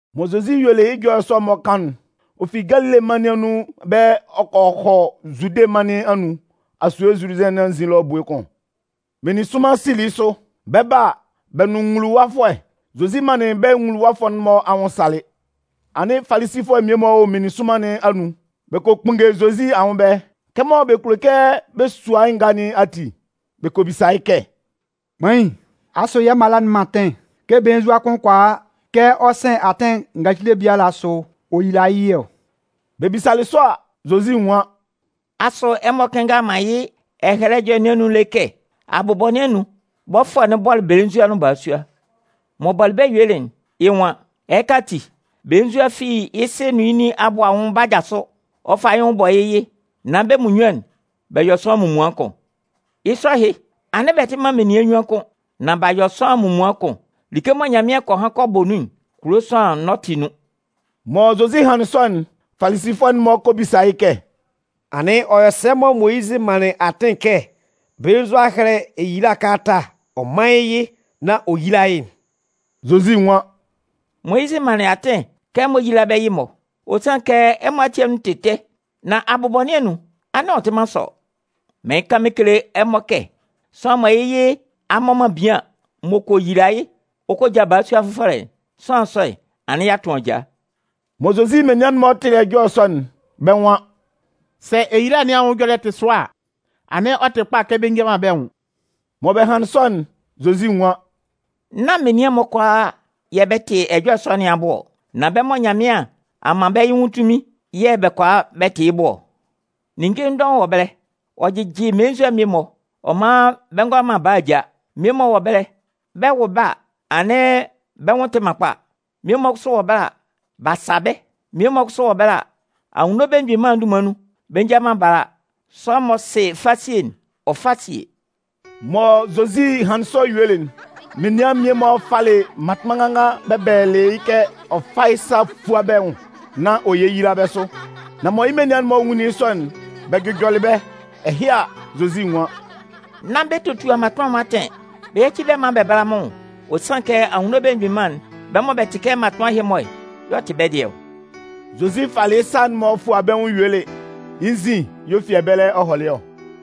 Mɔ Zozi yuelɩ yɩ́ ɛjɔlɛ sɔ'n-mɔ kan'n, ɔ fi Galile mân nɩn anun ɛbɛlɛ ɔ kɔ hɔ Zude mân nɩn anun, asue Zuludɩn nɩn anzin ɛlɔ ebue kʋn. Meninsʋnman sili yɩ́ sʋ. Bɛ 'ba a, bɛ nʋn nwuluwafʋɛ. Zozi manlɩn bɛ́ nwuluwafʋɛ'n-mɔ anwʋn salɩ. Anɩn Falisifʋɛ mmie-mɔ wɔ meninsʋnman nɩn anun. Bɛ kɔ kpunnge Zozi anwʋn ɛbɛlɛ. Kɛmɔ bɛ kulo kɛ bɛ sua yɩ́ ngaa nɩn ati, bɛ kɔ bisa yɩ́ kɛ: “Kpain, asʋ yɛ́ mala'n man atɩn kɛ belenzua kʋn kʋala kɛ ɔ sɩn atɩn ngacile biala asʋ ɔ yila yɩ́ yɩ ɔ?” Bɛ bisalɩ sɔ a, Zozi nwan: “Asʋ ɛmɔ kɩnngalɩ man yɩ́ Ɛhɛlɛ Ɛjɔlɛ nɩn anun lé kɛ abʋbɔ nɩn anun, Bɔfʋɛ'n bɔlɩ belenzua nʋn balasua. M'ɔ bɔlɩ bɛ́ yuelɩ'n, yɩ́ nwan: Ɛhɩka ati, belenzua'n fi yɩ́ sɩ nʋn yɩ́ nin abʋ anwʋn 'ba jasʋ. Ɔ 'fa yɩ́ nwʋn bɔ yɩ́ yɩ, nán bɛ́ munnyuan'n bɛ yɔ sʋanlan munmuan kʋn. Yɩ́ sɔ ɛhɩ, anɩn bɛ tɩ man menian nnyuan kʋ́n, nan b'a yɔ sʋanlan munmuan kʋn. Like mɔ Nyanmɩan kɔ han kɔ bɔ nun'n, kulo sʋanlan n'ɔ tɩ nun.” Mɔ Zozi hanlɩn sɔ'n, Falisifʋɛ'n-mɔ kɔ bisa yɩ́ kɛ: “Anɩn ɔ yɔ sɛ mɔ Moyizɩ manlɩn atɩn kɛ belenzua hɛ́lɛ eyila kalata ɔ mán yɩ́ yɩ nán ɔ yíla yɩ́'n?” Zozi nwan: “Moyizɩ manlɩn atɩn kɛ ɛmɔ yíla bɛ́ yɩ-mɔ. Ɔ sanlɩn kɛ ɛmɔ ati anun tɩ ɛtɛ. Nan abʋbɔ nɩn anun'n, anɩn ɔ tɩ man sɔ. Mɩɩn kan mɩn kele ɛmɔ kɛ sʋanlan mɔ yɩ́ yɩ a mmɔ man bian m'ɔ kɔ yila yɩ́ ɔ kɔ ja balasua fʋfɔlɛ'n, sʋanlan sɔ'n, anɩn ɔ'a tʋn ajaa.” Mɔ Zozi menian'n-mɔ tɩlɩ ɛjɔlɛ sɔ'n, bɛ́ nwan: “Sɛ eyila nɩn anwʋn ɛjɔlɛ'n tɩ sʋa a, anɩn ɔ tɩ kpa kɛ bɛ nja man bɛ́ nwʋn.” Mɔ bɛ hanlɩn sɔ'n, Zozi nwan: “Nán menian'n-mɔ kʋalaa yɛ̂ bɛ tɩ ɛjɔlɛ sɔ nɩn abʋ ɔ. Nan bɛ́ mɔ Nyanmɩan a man bɛ́ yɩ́ nwʋn tunmin'n yɛ̂ bɛ kʋala bɛ tɩ yɩ́ bʋ ɔ. Ninnge dɔʋn wɔ ɛbɛlɛ, ɔ jɩjɩ melenzua'n mmie-mɔ, ɔ man bɛ ngʋala man bala ja. Mmie-mɔ wɔ ɛbɛlɛ, bɛ 'wʋ bɛ́ a, anɩn bɛ́ nwʋn tɩ man kpa. Mmie-mɔ kʋsʋ wɔ ɛbɛlɛ, bɛ sa bɛ́. Mmie-mɔ kʋsʋ wɔ ɛbɛlɛ, Anwunno Belemgbin Mân'n dunman nun, bɛ nja man bala. Sʋanlan m'ɔ sɩ fasie'n, ɔ fá síe!” Mɔ Zozi hanlɩn sɔ yuelɩ'n, menian mmie-mɔ falɩ mmatʋnman nganngan bɛ bɛlɛlɩ yɩ́ kɛ ɔ fá yɩ́ sa ɔ fúa bɛ́ nwʋn nán ɔ yéyila bɛ́ sʋ. Nan mɔ yɩ́ menian'n-mɔ nwunlin yɩ́ sɔ'n, bɛ jʋjɔlɩ bɛ́. Ɛhɩ a, Zozi nwan: “Nán bɛ totua mmatʋnman'n-mɔ atɩn, bɛ yáci bɛ́ maan bɛ bála mɩ́n nwʋn. Ɔ sanlɩn kɛ Anwunno Belemgbin Mân'n, bɛ́ mɔ bɛ tɩ kɛ mmatʋnman ɛhɩ-mɔ'n y'ɔ tɩ bɛ́ dɩɛ ɔ.” Zozi falɩ yɩ́ sa'n-mɔ fualɩ bɛ́ nwʋn yuelɩ, yɩ́ nzin y'ɔ fi ɛbɛlɛ ɔ hɔlɩ ɔ.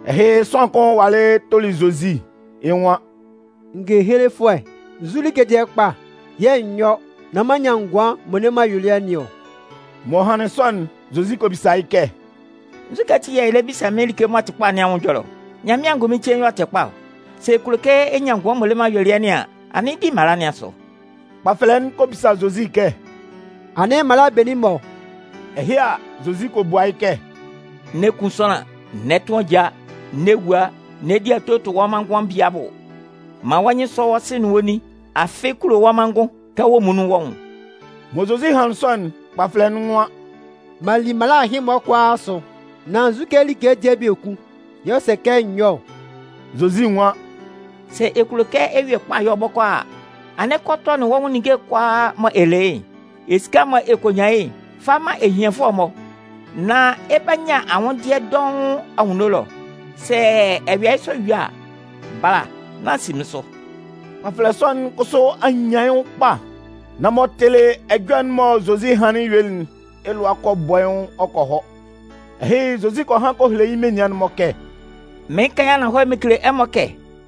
Ɛhɩ, sʋanlan kʋn walɩ tʋlɩ Zozi, yɩ́ nwan: “Ngehelefʋɛ, nzu like dɩɛ kpa yɛ̂ n yɔ́ nán m'an nyan ngʋan m'ɔ le man ayuelɩɛ nɩn ɔ?” M'ɔ hanlɩn sɔ'n, Zozi kɔ bisa yɩ́ kɛ: “Nzukɛ ati yɛ̂ ɛ lɛ bisa mɩ́n like m'ɔ tɩ kpa nɩn anwʋn ɛjɔlɛ ɔ? Nyanmɩan angʋnmɩn cein y'ɔ tɩ kpa ɔ. Sɛ ɛ kulo kɛ ɛ nyan ngʋan m'ɔ le man ayuelɩɛ nɩn an, anɩn di mala'n-mɔ asʋ.” Kpafɛlɛ'n kɔ bisa Zozi kɛ: “Anɩn mala benin-mɔ?” Ɛhɩ a, Zozi kɔ bua yɩ́ kɛ: “N'ɛ kun sʋanlan, n'ɛ tʋn ajaa, n'ɛ wua, n'ɛ di ato ɛ tʋ wɔ́ manngʋn bie abʋ, man wɔ́ nyɩn sɔ́ wɔ́ sɩ nʋn wɔ́ nin, afɩ kulo wɔ́ manngʋn kɛ wɔ́ muonun wɔ́ nwʋn.” Mɔ Zozi hanlɩn sɔ'n, kpafɛlɛ'n nwan: “M'an li mala ɛhɩ-mɔ kʋalaa asʋ. Nan nzukɛ like dɩɛ biekun y'ɔ sɛ kɛ n yɔ́ ɔ?” Zozi nwan: “Sɛ ɛ kulo kɛ ɛ yue kpa yɔ bɔkɔɔ a, anɩn kɔ tɔnɩn wɔ́ ninnge'n kʋalaa mɔ ɛ le yɩ́'n. Esika'n mɔ ɛ kɔ nyan yɩ́'n, fa man ehianfʋɛ'n-mɔ, nán ɛ 'ba nyan anwʋndɩɛ dɔʋn anwunno ɛlɔ. Sɛ ɛ yɔ yɩ́ sɔ yue a, bala nán si mɩ́n sʋ.” Kpafɛlɛ sɔ'n kʋsʋ a nyan yɩ́ nwʋn kpa. Nan m'ɔ tɩlɩ ɛjɔlɛ'n mɔ Zozi hanlɩn helelɩ yɩ́'n, yɩ́ lʋa bɔlɩ yɩ́ nwʋn ɔ kɔ hɔ. Ɛhɩ, Zozi kɔ han kɔ hele yɩ́ menian'n-mɔ kɛ: “Mɩɩn kan yɩ́ ananhɔlɛ mɩn kele ɛmɔ kɛ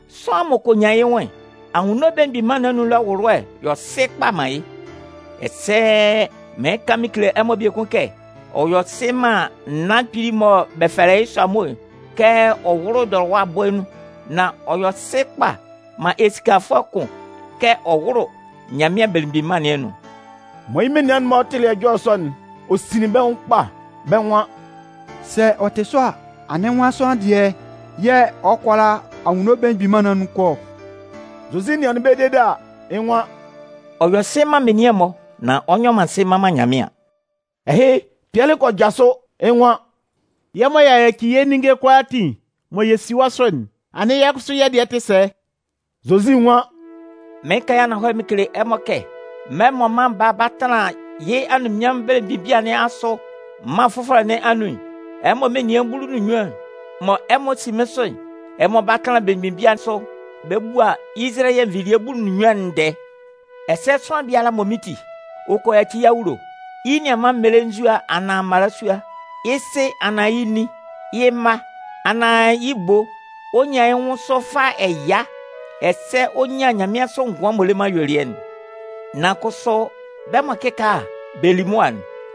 sʋanlan m'ɔ kɔ nyan yɩ́ nwʋn'n, Anwunno Belemgbin Mân nɩn anun ɛlɔ ɛwʋlʋɛ yɔ sɩ kpa man yɩ́. Ɛsɛ mɩɩn kan mɩn kele ɛmɔ biekun kɛ: ɔ yɔ sɩ man naan kpili'n mɔ bɛ fɛlɛ yɩ́ sʋamo'n kɛ ɔ wʋ́lʋ dɔlɔwa bɔɛ nun. Nan ɔ yɔ sɩ kpa man esikafʋɛ kʋn kɛ ɔ wʋ́lʋ Nyanmɩan Belemgbin Mân nɩn anun.” Mɔ yɩ́ menian'n-mɔ tɩlɩ ɛjɔlɛ sɔ'n, ɔ sinlin bɛ́ nwʋn kpa. Bɛ́ nwan: “Sɛ ɔ tɩ sɔ a, anɩn nwan sʋanlan dɩɛ yɛ̂ ɔ kʋala Anwunno Belemgbin Mân nɩn anun kɔ ɔ?” Zozi nɩanlɩn bɛ́ dede a, yɩ́ nwan: “Ɔ yɔ sɩ man menian'n-mɔ, nan ɔ nyɔ sɩ mman man Nyanmɩan.” Ɛhɩ, Pɩɛlɩ kɔ jasʋ, yɩ́ nwan: “Yɛ́ mɔ y'a yaci yɛ́ ninnge'n kʋalaatin mɔ yɛ si wɔ́ sʋ'n, anɩn yɛ́ kʋsʋ yɛ́ dɩɛ tɩ sɛ?” Zozi nwan: “Mɩɩn kan yɩ́ ananhɔlɛ mɩn kele ɛmɔ kɛ mɛlɛ mɔ Mân Baa'n 'ba tanlan yɩ́ anunminnyanmʋn belemgbin bia nɩn asʋ mân fʋfɔlɛ nɩn anun'n, ɛmɔ menian bulu nʋn nnyuan'n mɔ ɛmɔ si mɩ́n sʋ'n, ɛmɔ 'ba tanlan belemgbin bia sʋ bɛ bua Izalayɛ nvilie bulu nʋn nnyuan'n ndɛɛ. Ɛsɛ sʋanlan biala mɔ mɩ́n ti, ɔ kɔ yaci yɩ́ awulo, yɩ́ nianman mmelenzua anaan mmalasua, yɩ́ sɩ anaan yɩ́ nin, yɩ́ mma, anaan yɩ́ ebo, ɔ 'nyan yɩ́ nwʋn sʋ fâ ɛya, ɛsɛ ɔ 'nyan nyanmɩansʋ ngʋan m'ɔ le man ayuelɩɛ'n. Nan kʋsʋ, bɛ́ mɔ kɩkaala bɛ li mʋa'n,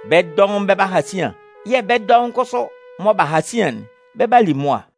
bɛ́ dɔʋn bɛ 'ba ha sian. Yɛ̂ bɛ́ dɔʋn kʋsʋ mɔ bɛ halɩ sian'n, bɛ 'ba li mʋa.